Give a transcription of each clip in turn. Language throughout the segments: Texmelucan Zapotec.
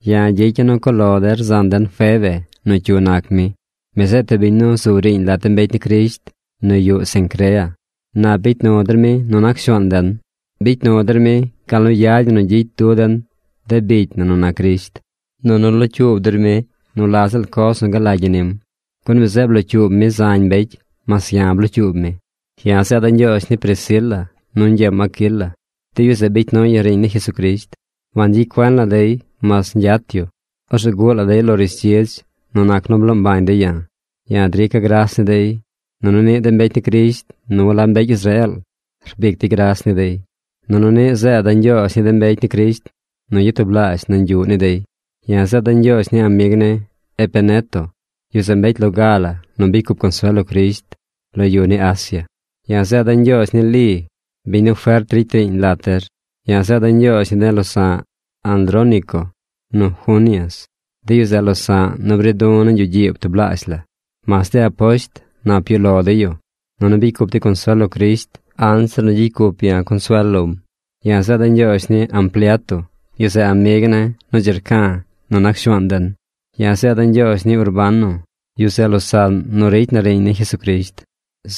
Ya̱ gyicya̱ nu cuꞌ lo der zan den Febe nu cyu nac mi. Mi zeꞌ tub biñ nu zu riiñ lat de mbecy ni Crisht nu yuꞌ Cencrea. Nap bicy nu der mi nu nac Shuaan den. Bicy nu der mi gal nu yad ñi nu gyicy du den de bicy na nu nac Crisht. Nunu locyuub der mi nu la ziꞌl coz nu galagy ñi nim, gun mi zeꞌ blocyuub mi zañ mbecy. Mas ya̱ blocyuub mi. Ya̱ zeeda̱ ñgyoozh ni Priscila nu ñgyeem Aquila. De yu zeꞌ bicy nuy ya̱ riiñ ni Jesucrisht. Wangyicy cuen la dey mas ñgyat yu. Orzeꞌ guꞌ la dey lo rishdzidz nu nac nu bloo mbañ dey ya̱. Ya̱ drica̱ gras ni dey, nunu niꞌ de mbecy ni Crisht nu walab mbecy Israeel rbic dey gras ni dey. Nunu niꞌ zeeda̱ ñgyoozh ni de mbecy ni Crisht nu yatublaazh nañ yuꞌ ni dey. Ya̱ zeeda̱ ñgyoozh ni amig ne̱ Epeneto. Yu zeꞌ mbecy loga la nu bicy cup consuel lo Crisht lo yu ni Asia. Ya̱ zeeda̱ ñgyoozh ni Li, biñ nu fert ricy riiñ lat der. Ya̱ zeeda̱ ñgyoozh ni de losa̱ꞌ Andrónico nu Junias. De yu zeꞌ losa̱ꞌ nu bri du̱ nañ yuꞌ gyiib tublaazh la. Mas de aposht nap yuꞌ lo dey yu. Nunu bicy cup dey consuel lo Crisht anzir nu gyicy cup ya̱ consuel lom. Ya̱ zeeda̱ꞌ ñgyoozh ni Ampliato. Yu zeꞌ amig ne̱ nu dzi rca nu nac Shuaan den. Ya zeeda̱ꞌ ñgyoozh ni Urbano. Yu zeꞌ losaꞌn nu ricy na riiñ ni Jesucrisht.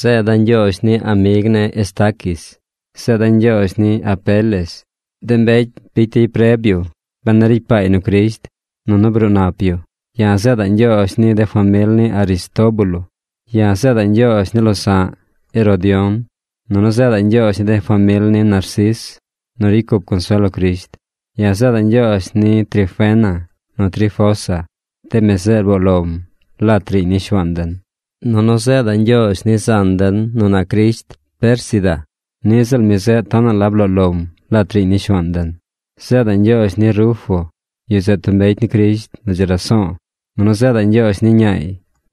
Zeeda̱ꞌ ñgyoozh ni amig ne̱ Estaquis. Zeeda̱ꞌ ñgyoozh ni Apeles. De mbecy bicy dey preb yu ben a ricy paay nu Crisht, nunu bruu nap yu. Ya̱ zeeda̱ꞌ ñgyoozh ni de famil ni Aristóbulo. Ya̱ zeeda̱ꞌ ñgyoozh ni losa̱ꞌ Herodión. Nunu zeeda̱ꞌ ñgyoozh ni de famil ni Narcis nu ricy cup consuel lo Crisht. Ya̱ zeeda̱ꞌ ñgyoozh ni Trifena nu Trifosa. De mi zeꞌ rboo lom lat riiñ ni Shuaan den. Nunu zeeda̱ꞌ ñgyoozh ni zan den nu nac Crisht Pérsida. Niꞌ ziꞌl mi zeꞌ tonaꞌ la bloo lom lat riiñ ni Shuaan den. Zeeda̱ꞌ ñgyoozh ni Rufo. Yu zeꞌ tub mbecy ni Crisht nu dzi raso̱o̱. Nunu zeeda̱ꞌ ñgyoozh ni ñaay.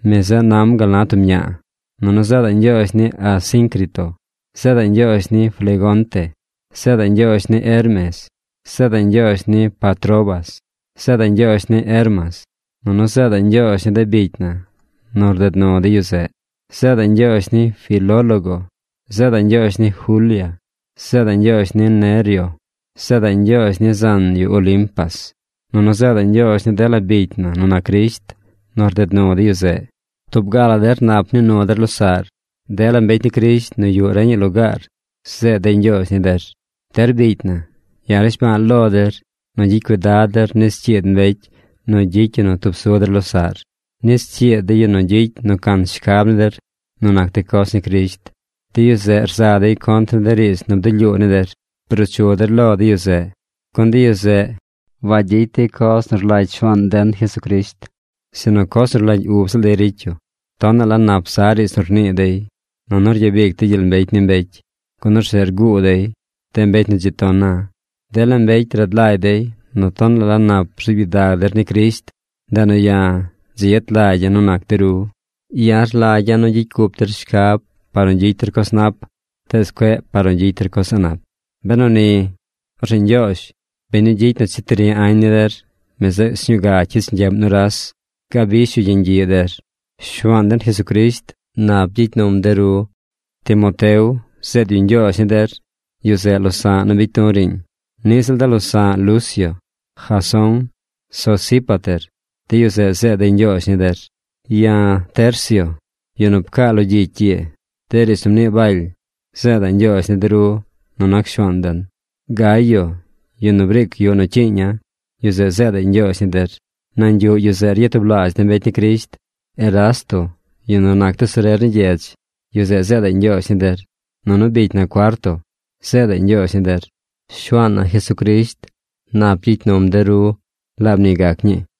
Mi zeꞌ nam gal na tub ña̱a̱. Nunu zeedaꞌ ñgyoozh ni Asíncrito. Zeeda̱ꞌ ñgyoozh ni Flegonte. Zeedaꞌ ñgyoozh ni Hermes. Zeeda̱ꞌ ñgyoozh ni Patrobas. Zeeda̱ꞌ ñgyoozh ni Hermas. Nunu zeeda̱ꞌ ñgyoozh ni de bicy na nu rded nu de yu zeꞌ. Zeeda̱ꞌ ñgyoozh ni Filólogo. Zeeda̱ꞌ ñgyoozh ni Julia. Zeeda̱ꞌ ñgyoozh ni Nereo. Zeeda̱ꞌ ñgyoozh ni zan yu Olimpas. Nunu zeeda̱ꞌ ñgyoozh ni dela bicy na nu nac Crisht nu rded nu de yu zeꞌ. Tub ga la der nap nii nu der losaꞌr. Dela mbecy ni Crisht nu yuꞌ reñaꞌ lugaar zeed dey ñgyoozh ni der. Der bicy na, ya̱ rnishba̱a̱ lo der nu gyicy cuidad der nis cyiid mbecy nu gyicy yu nu tub su der losaꞌr, nis cyiid de yu nu gyicy nu can shcab ni der nu nac de coz ni Crisht. De yu zeꞌ rza dey contr ni de riidz nu bdulyuu ni der. Bruu chu der lo de yu zeꞌ. Gun de yu zeꞌ wagyicy dey coz nu rlagy Shuaan den Jesucrisht, sinu coz nu rlagy ub ziꞌl dey ricy yu. Tonaꞌ la nap za riidz nu rnii dey, nunu ryabic dey gyel mbecy ni mbecy, gun orzeꞌ rguu dey de mbecy nu dzi ton na. Dela mbecy rad lagy dey nu tonaꞌ la nap rzuub gyidag der ni Crisht, ndeꞌ nu ya̱ dzi yet lagya̱ nu nac de ru. Ya̱ rlagya̱ nu gyicy cup der shcab par nu gyicy der coz nap, tees cueꞌ par nu gyicy der coz a̱ꞌ nap. Benu ni, orzeꞌ Ñgyoozh, biñ nu gyicy nu cheti ri añ ni der, mi zeꞌ sñuu ga cyich ñgyeꞌm nuras. Gabish yu yeñ gyiꞌ der. Shuaan den Jesucrisht nap gyicy num der. Timoteo zeed yu ñgyoozh ni der. Yu zeꞌ losa̱ꞌ nu bicy du̱ riiñ. Niꞌ ziꞌl de losa̱ꞌ Lucio, Jasón, Sosípater, de yu zeꞌ zeed dey ñgyoozh ni der. Ya̱, Tercio, yu nu pcaa lo gyicy ii de riidz nu mnii Baly, zeeda̱ꞌ ñgyoozh ni de ru nu nac Shuaan den. Gayo, yu nu briic yuꞌ nu cyiiña̱, yu zeꞌ zeedaꞌy ñgyoozh ni der. Nañ yuꞌ yu zeꞌ ryatublaazh de mbecy ni Crisht. Erasto, yu nu nac tesorer ni gyedz, yu zeꞌ zeedaꞌy ñgyoozh ni der. Nunu bicy na Cuarto zeedaꞌy ñgyoozh ni der. Shuaan na Jesucrisht nap gyicy num der. Laab ni gac ñii.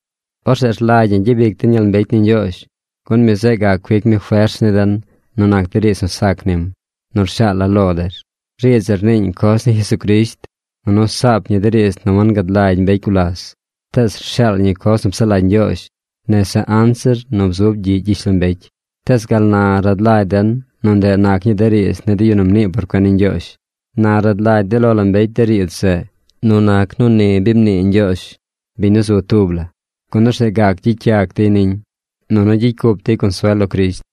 Orzeꞌ rlagy ñi gyabic den gyel mbecy ni Ñgyoozh, gun mi zeꞌ gac cuic mi fers ni den nu nac de riidz nu sac nim, nu rshaala̱ lo der. Riidz zeꞌ rniiñ coz ni Jesucrisht, nunu saap ñi de riidz nu wangad lagy mbecy gulas tees rshaal ñi coz nu psaꞌ lagy Ñgyoozh nese anzir nu bzub gyiꞌ gyishlombecy. Tees gal na rad lagy den nu ndeꞌ nac ñii de riidz ni de yu nu mnii por cuen ni Ñgyoozh. Na rad lagy de lo la mbecy de riidz zeꞌ nu nac nu ni bi mnii Ñgyoozh, biñ nu zu tub la, gun orzeꞌ gac gyicy yac dey niñ nunu gyicy cup dey consuel lo Crisht.